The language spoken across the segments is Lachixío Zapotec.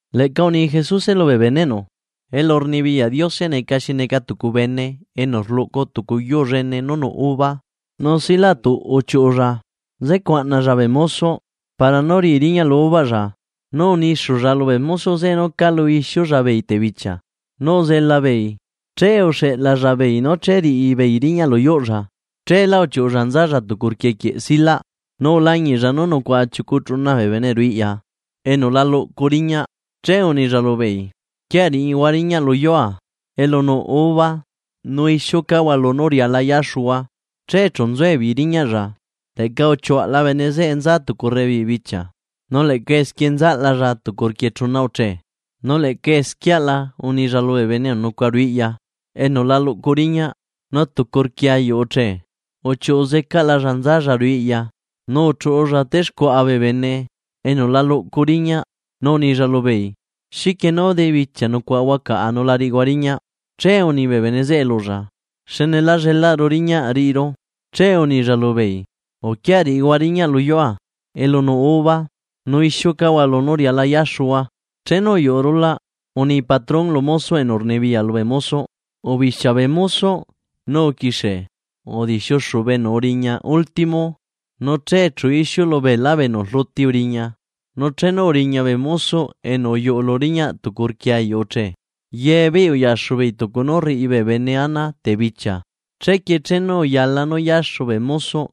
Leꞌca uni Jesuse lubee beneꞌnu. ―Elurnibiyaꞌ Diose neca xi neca tucu bene enu rluꞌcu tucu yuu llene nú nuꞌ uva, nu silaꞌtuꞌ uchiuꞌulla nzecuaꞌnalla bee mosoꞌ para nú riꞌi riñaꞌ lu uvaꞌlla. Nu unixulla lubee mosoꞌ zeꞌe nú calu ixiulla beei tebichia nu uzela beei, che uxeꞌlalla beei nú che riꞌi beei riñaꞌ lu yuꞌlla. Cheelá uchiuꞌulla nzalla tucu rquie quieꞌ silaꞌ nu ulañiꞌlla nú nucuaꞌa chiucu chuna bee bene ruꞌu iꞌya enu la luꞌcu riñaꞌ. Che unilla lubeei: “Uquia riꞌihua riñaꞌ lu yuua elu nuꞌ uva nu ixiucahua lunú riala yaxuhua.” Che chu nzuebeei riñaꞌlla. Leꞌca uchiuaꞌla bene zeꞌe nzalla tucu rebibichia, nu leꞌca esquie nzaꞌlalla tucu rquie chuna uche, nu leꞌca esquieꞌala unilla lubee bene enu nucuaꞌa ruꞌu iꞌya enu la luꞌcu riñaꞌ. Nu tucu rquie ayuꞌ uche, uchiuꞌu zecaꞌlalla nzalla ruꞌu iꞌya nu uchuꞌulla stexcuaꞌa bee bene enu la luꞌcu riñaꞌ, nu unilla lubeei: “¿Xiquie nú debichia nucuaꞌahua caꞌa nu la riꞌihua riñaꞌ?” Che uni bee bene zeꞌe lulla: “Xne lá llelaꞌru riñaꞌ riꞌiru.” Che unilla lubeei: “Uquia riꞌihua riñaꞌ lu yuua, elu nuꞌ uva nu ixiucahua lunú riala yaxuhua.” ’Chenu uyuꞌu rulaꞌ, uni patrón lu mosoꞌ enu rnibiyaꞌ lubee mosoꞌ: “Ubixia bee mosoꞌ nu uquixie udixiuxu bee enu uriña último, nuche chu ixiulu beelá bee enu rluti uriña.” Nu chenu uriña bee mosoꞌ enu uyuꞌu lu riñaꞌ tucu rquie ayuꞌ uche, ye beei uyaxu beei tucu nú rriꞌi bene ana tebichia. Chequie chenu uyala nú yaxu bee mosoꞌ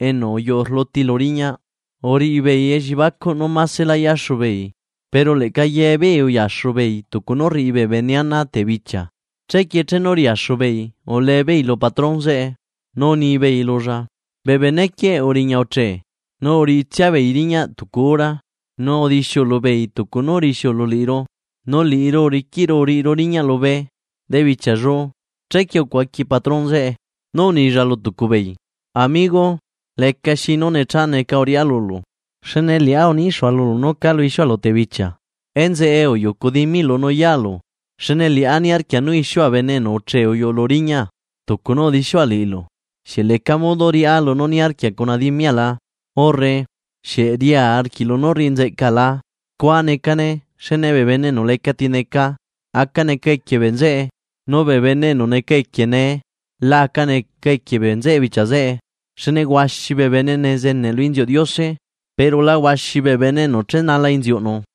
enu uyuꞌu rluti lu riñaꞌ, uriꞌi beei elliebacuꞌ nú maselá yaxu beei, pero leꞌca ye beei uyaxu beei tucu nú rriꞌi bene ana tebichia. Chequie chenu riaxu beei ulebeei lu patrón zeꞌe, nu unibeei lulla: “Bee bene quieꞌ uriña uche, nu uriꞌitsia beei riñaꞌ tucu hora nu udixiulu beei tucu nú rixiulu liꞌiru, nu liꞌiru uriquiꞌru uriꞌiru riñaꞌ lubee debichiallu.” Chequie ucuaqui patrón zeꞌe, nú unilla lu tucu beei: “Amigo, lecaxi nú necha neca uriꞌá lulu. Xne liꞌá unixua lulu nú calu ixiualu tebichia. Enzeꞌe uyucu dimiꞌlu nu yaalu. Xne liꞌá niarquia nú ixiua bene enu uche uyuꞌu lu riñaa tucu nú udixiua liꞌilu. ¿Xieꞌ leca modo riꞌá lunú niarquia cuna dimiala?, urre ¿Xieꞌ ria arquiꞌlu nú rriꞌi nzeꞌca la?” Scua necane, xne bee bene enu leca tineca nee aca neca equie bee nzeꞌe, nu bee bene enu neca equie nee la aca neca equie bee nzeꞌe bichia zeꞌe. Xne huaxi bee bene nezeneꞌ lu inziuꞌ Diose pero la huaxi bee bene enu chenala inziuꞌnu.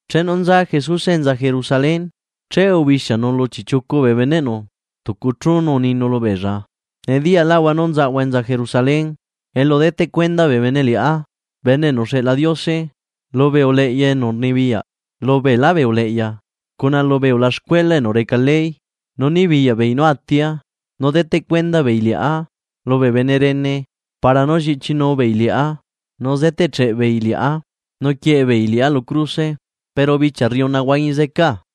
Chenu nza Jesuse enza Jerusalén, che ubixianu lu chiꞌchiucu bee beneꞌnu tucu chú nu uninu lubeella: ―Nediyaꞌlaꞌhua nú nzaꞌahua enza Jerusalén elu deteꞌ cuenda bee bene Liꞌá Bene enu uxeꞌla Diose lubee uleꞌya enu rnibiyaꞌ lubeelá bee uleꞌya, cuna lubee ulaxcuela enu reca ley, nu nibiyaꞌ beei nú atia. Nu deteꞌ cuenda beei Liꞌá lubee bene rene para nú lliꞌchinu beei Liꞌá, nu zeteꞌcheꞌ beei Liꞌá nu quieꞌe beei Liꞌá lu cruse, pero bichia rriuna huañi zecaa.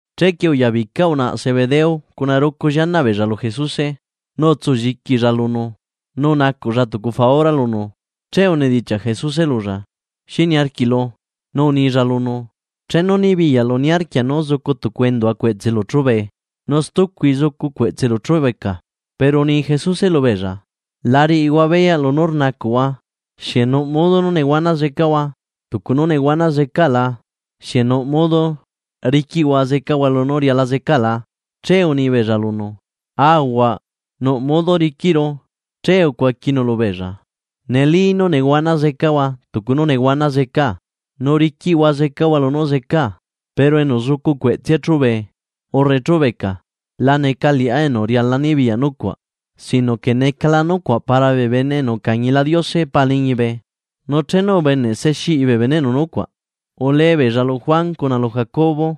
Chequie uyabica unaꞌa Zebedeo cuna rucu llianaꞌ beella lu Jesuse, nu utsulliquilla lunu, nu unacuꞌlla tucu faura lunu. Che unedichiaꞌ Jesuse lulla: ―¿Xi niarquiꞌlu? Nu unilla lunu: ―Chenu nibiyaꞌlu niarquia nú zucu tucu endua cueꞌtselu chúbe, nu stucui zucu cueꞌtselu chúbeca. Pero uni Jesuse lubeella: ―La riꞌihua beyaꞌ lunú rnacuꞌhua. ¿Xieꞌ nuꞌ modo nú nehuana zecahua tucu nú nehuana zecaa la? ¿Xieꞌ nuꞌ modo riquiꞌhua zecahua lunú riala zecaa la? Che uni beella lunu: ―Aahuaꞌ, riquiꞌru. Che ucuaquinu lubeella: ―Neli nú nehuana zecahua tucu nú nehuana zecaa. Nu riquiꞌhua zecahua lunú zecaa. Pero enu zucu cueꞌtsea chúbe urre chubeca. La neca Liꞌá enu riala nibiyaꞌ nucuaꞌ, sino que necala nucuaꞌ para bee bene enu ucañila Diose Paa liñibe. Nu chenu ubeneꞌ se xiꞌi bee beneꞌnu nucuaꞌ, ule beella lu Juan cuna lu Jacobo.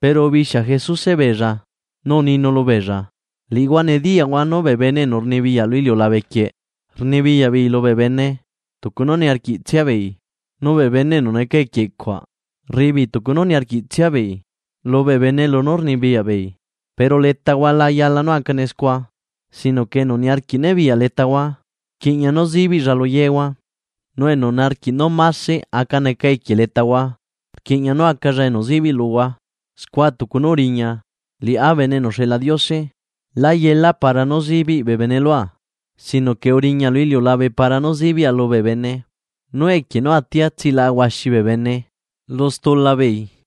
Pero ubixia Jesuse beella nu uninu lubeella: ―Liꞌihua nediyaꞌhua, nú bee bene enu rnibiyaꞌ lu iliulabe quieꞌ rnibiyaꞌ beei lubee bene tucu nú niarquiꞌtsia beei, nu bee bene enu neca equie cuaꞌ rriꞌi beei tucu nú niarquiꞌtsia beei lubee bene lunú rnibiyaꞌ beei. Pero letahua la yala nú acane scua. Sino que enu niarquiꞌ nibiyaꞌ letahua, rquiꞌña nú zibiꞌlla lu yehua, nu enu niarquiꞌ nú mase aca neca equie letahua, rquiꞌña nú acalla enu zibiꞌ luhua, scua tucu nú uriña Liꞌá Bene enu uxeꞌla Diose, lá yela para nú zibiꞌ bee bene lua, sino que uriña lu iliulabe para nú zibiꞌa lubee bene, nu equie nú atia tsilaꞌa huaxi bee bene lu stula beei.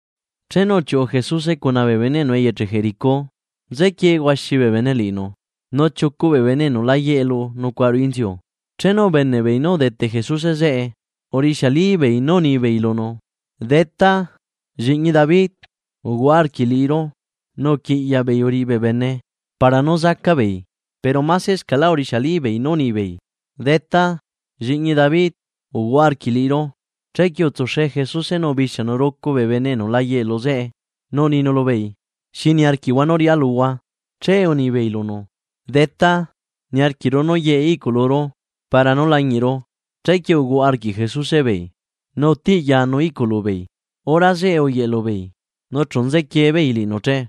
Chenu uchiuꞌu Jesuse cuna bee beneꞌnu eyeche Jericó, nzequie huaxi bee bene liꞌinu. Nu chiucu bee bene enu la yeꞌelu nucuaꞌa ruꞌu inziu, chenu ubeneꞌ beei nú udete Jesuse zeꞌe, urixialibeei nú unibeei lunu: ―¡Detá, lliꞌñi David, uhuaꞌa arquiꞌ liꞌiru! Nu uquiꞌyaꞌ beei uriꞌi bee bene para nú zaca beei, pero masescaꞌlá urixialibeei nú unibeei: ―¡Detá, lliꞌñi David, uhuaꞌa arquiꞌ liꞌiru! Chequie utsuxe Jesuse nu ubixianu rucu bee bene enu la yeꞌelu zeꞌe nu uninu lubeei: ―¿Xi niarquiꞌhua nú riꞌá luhua? Che unibeei lunu: ―Detá, niarquiꞌru nú yeꞌe iꞌculuru para nú lañiꞌru. Chequie uhuaꞌa arquiꞌ Jesuse beei, nu utiꞌyanu iꞌculu beei. Hora zeꞌe uyeꞌe lubeei, nu chu nzequie beei liꞌinu che.